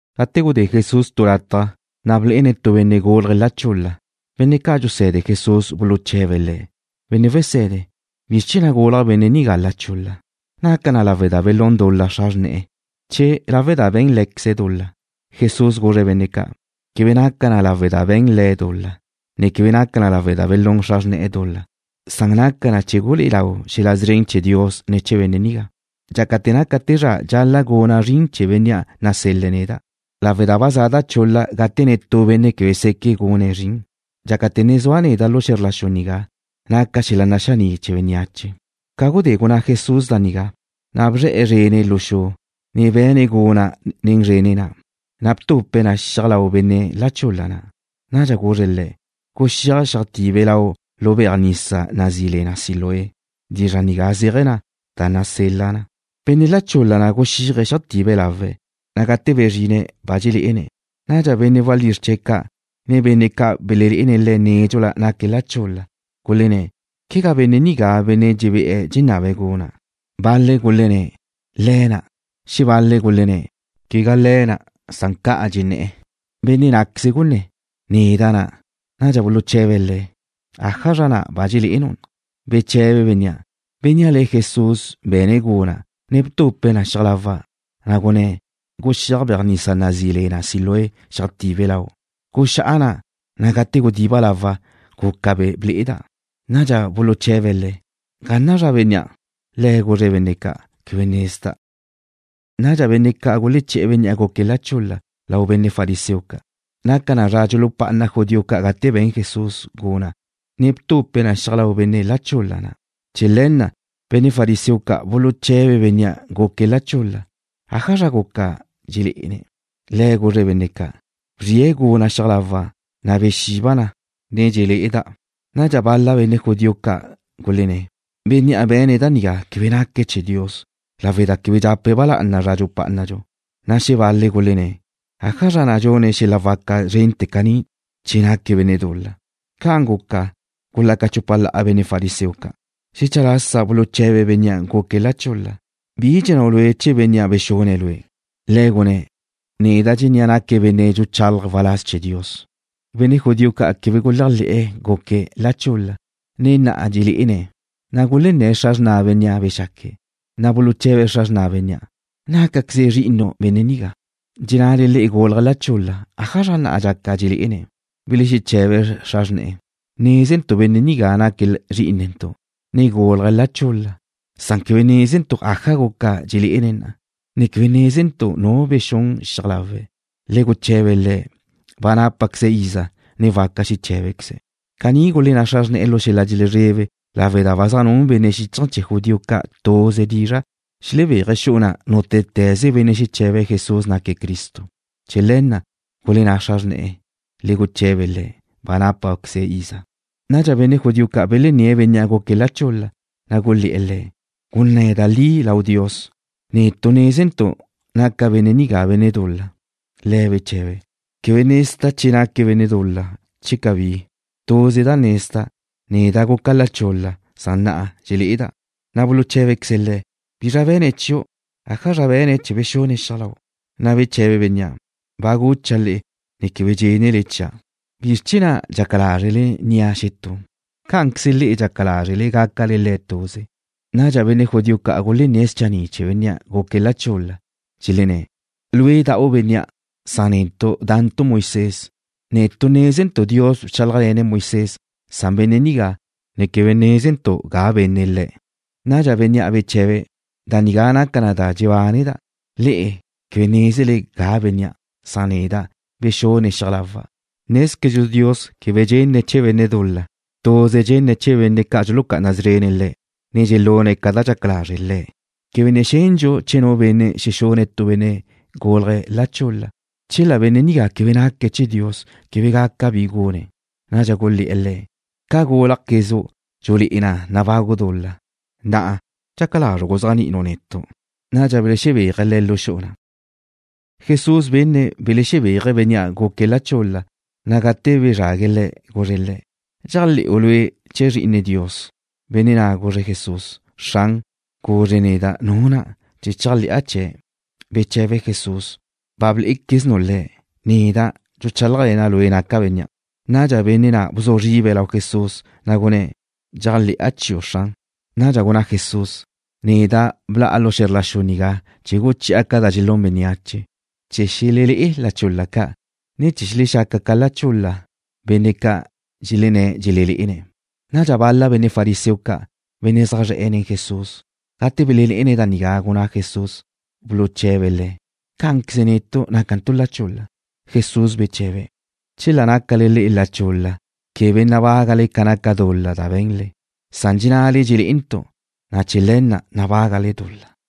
Gate gudé Jesús tu lataj, na' blé'ene̱' tu benne' gúlaje̱' la chul-la. Benne' ca' dxuse̱de Jesús buluche̱be̱' Le̱': ―Benne' Wese̱de, ¿bizr chee̱ na' gulaj benne' nigá la chul-la? ¿Naca na lawe' da belún xra xrne̱'e̱ dul-la, che lawe' da be̱n lé̱queze̱' dul-la? Jesús guzre̱' benne' ca': ―Quebe naca na lawe' da be̱n le̱' dul-la, ne quebe naca na lawe' da belún xra xrne̱'e̱ dul-la. Naca na chee̱ gulé'e lau xel-la' szren chee̱ Dios ne̱ chee̱ benne' nigá. Dxácate̱ naca te zra dxal-la' guna' zrin chee̱ Bénnea' nasel-le̱' neda' lawe' da ba za da chul-la gate netú benne' quebe seque' gune̱' zrin. Dxácate̱ ne zua' neda' xe̱zr la xu nigá, naca' xel-la' naxaní' chee̱ bénneache. Ca gudé gunná Jesús da nigá, na' bzre̱'e̱ zrene̱' lu xu, ne be̱ne̱' guna' nen zrene̱' na', na' btupe̱' na xiaj lau benne' la chul-la na'. Nadxa guzre̱' le̱': ―Guxíaj xeajtibe lau' lu beaj nisa nazí le na Siloé. (Dizra' nigá zéaje̱ na: Da Nasel-la Na.) Benne' la chul-la na' guxíaje̱' xeajtibe lawe̱', na' gate bezrine̱' ba dxelé'ene̱'. Nadxa benne' walízr chee̱' ca', ne benne' ca' belelé'ene̱' le̱' nédxula, naque̱' la chul-la, gulenné̱': ―¿Quegá benne' nigá bénnea' dxebé'e̱ dxenabe̱' guna'? Bal-le̱' gulenné̱': ―Le̱' na'. Xebal-le̱' gulenné̱': ―Quegá le̱' na', na' ca'an ca dxenné̱'e̱. Benne' ná'queze gunné̱': ―Neda' na'. Nadxa buluche̱be̱' le̱': ―¿Ájazra na' ba dxelé'enu'? Beche̱be bénnea': ―Bénnea' le̱' Jesús be̱ne̱' guna', ne btupe̱' na xiaj lawa', na' gunné̱': “Guxíaj beaj nisa nazí le na Siloé, xeajtibe lau'.” Guxá'a na', na' gate gudiba' lawa', guca ble'eda'. Nadxa buluche̱be̱' le̱': ―¿Ga na' zua bénnea'? Le̱' guzre̱' benne' ca': ―Quebe nezda'. Nadxa benne' ca' guleché̱'e̱ bénnea' guque̱' la chul-la lau benne' fariseo ca'. Naca na zra dxulupá'ana judío ca' gate be̱n Jesús guna', ne btupe̱' na xiaj lau benne' la chul-la na'. Chee̱ le̱ na' benne' fariseo ca' buluche̱be̱' bénnea' guque̱' la chul-la ájazra guca dxelé'ene̱'. Le̱' guzre̱' benne' ca': ―Bzrie̱' guna' xiaj lawa', na' bexiba' na, ne dxelé'eda'. Nadxa bal-la benne' judío ca' gulenné̱': ―Bénnea' be̱ne̱' da nigá quebe naque̱' chee̱ Dios lawe' da quebe dxape̱' ba lá'ana zra dxupá'anadxu. Na' xebal-le̱' gulenné̱': ―¿Ájazra na' dxune̱' xel-la' waca zrente̱ caní che naque̱' benne' dul-la? Ca'an guca, gulaca chupa la'a benne' fariseo ca'. Xecha lasa buluche̱be̱' bénnea' guque̱' la chul-la: ―¿Bi dxennáu' lue' chee̱ bénnea' bexune̱' lue'? Le̱' gunné̱': ―Neda' dxennéa' naque̱' benne' dxuchalaje̱' waláz chee̱ Dios. Benne' judío ca' quebe guléajle̱'e̱ guque̱' la chul-la, ne na'a dxelé'ene̱', na' gulenné̱' xra xrna bénnea' bexaque̱'. Na' buluche̱be̱' xra xrna bénnea': ―¿Nácaqueze benne' nigá zrí'inele, dxennale le'e gúlaje̱' la chul-la? ¿Ájazra na' dxaca dxelé'ene̱'? Belexeche̱be xra xrne̱'e̱: ―Nézentu' benne' nigá naque̱' zrí'inentu', ne gúlaje̱' la chul-la. Quebe nézentu' aja guca dxelé'ene̱' na'a, ne quebe nézentu' nu bexún xiaj lawe̱'. Le guche̱be le̱'. Ba nápaqueze̱' iza, ne waca xeché̱bequeze̱'. Caní gulenná xra xrne̱'e̱ lu xel-la' dxelezrebe lawe' da ba zaj nun benne' xíchaje̱ chee̱ judío ca' tuze dizra' xelexebéaje̱' xu'u na' nútete̱ze benne' xeche̱be̱' Jesús naque̱' Cristo. Chee̱ le̱ na' gulenná xra xrne̱'e̱: “Le guche̱be le̱'. Ba nápaqueze̱' iza.” Nadxa benne' judío ca' belenné̱' bénnea' guque̱' la chul-la, na' gulé̱'e̱ le̱': ―¡Gunné̱ da li lau Dios! Nézentu' naca benne' nigá benne' dul-la. Le̱' beche̱be̱': ―Quebe nezda' che naque̱' benne' dul-la, che cabí. Tuze da nezda'. Neda' guca' la chul-la, na' na'a dxelé'eda'. Na' buluché̱bequeze̱' le̱': ―¿Bizra be̱ne̱' chiu'? ¿Ájazra be̱ne̱' chee̱ bexune̱' xiaj lau'? Na' beche̱be bénnea': ―Ba gucha' le'e, ne quebe dxénele chia'. ¿Bizr chee̱ na' dxaca lázrele nnia' xetú? ¿Cá'anqueze le'e dxaca lázrele gácale Le̱' tuze? Nadxa benne' judío ca' gulenné̱' schanni' chee̱ bénnea' guque̱' la chul-la, dxelenné̱': ―Lue' da'u bénnea', na' netu' da'ntu' Moisés. Netu' nézentu' Dios bchálajle̱ne̱' Moisés. Quebe nézentu' ga benne' benne' nigá. Nadxa bénnea' beche̱be̱': ―Da nigá naca na da dxebáneda'. Le'e quebe nézele ga bénnea', na' bexune̱' xiaj lawa'. Nézquezdxu Dios quebe dxenne̱' chee̱ benne' dul-la. Tuze dxenne̱' chee̱ benne' ca' dxulucá'ana szrene̱' Le̱', ne dxelune̱' ca da dxaca lazre' Le̱'. Quebe ne xendxu che nu benne' xexune̱' tu benne' gúlaje̱' la chul-la. Chela benne' nigá quebe naque̱' chee̱ Dios, quebe gaca bi gune̱'. Nadxa gulé̱'e̱ le̱': ―Ca gúlajquezu' dxulé'e na nabagu' dul-la. Na'a, ¿dxaca lazru' guzéajni'inu' netu'? Nadxa belexebéaje̱' le̱' lu xu'u na'. Jesús benne̱' belexebéaje̱' bénnea' guque̱' la chul-la, na' gate bezrague̱' le̱', guzre̱' le̱': ―¿Dxéajle̱'u lue' chee̱ Zri'ine Dios? Benne' na' guzre̱' Jesús: ―Xran, guzre neda' Nu na', chee̱ chéajle̱'a chee̱'. Beche̱be Jesús: ―Ba blé'equeznu' Le̱'. Neda', dxuchálajle̱na' lue' naca' Bénnea'. Nadxa benne' na' bzu zribe̱' lau Jesús, na' gunné̱': ―Dxéajle̱'a chiu', Xran. Nadxa gunná Jesús: ―Neda' bla'a lu xe̱zr la xu nigá chee̱ guchi'a ca da dxelún bénneache, chee̱ xelelé'e la chul-la ca', ne chee̱ xelexaca ca la chul-la benne' ca' dxelenné̱' dxelelé'ene̱'. Nadxa bal-la benne' fariseo ca', benne' zaj zre̱'e̱ nen Jesús, gate belenne̱' da nigá gunná Jesús, buluche̱be̱' Le̱': ―¿Cá'anqueze netu' nácantu' la chul-la? Jesús beche̱be̱': ―Chela nácale le'e la chul-la quebe nabágale ca naca dul-la da be̱nle. Dxennale dxelé'ele, na' chee̱ le̱ na' nabágale dul-la.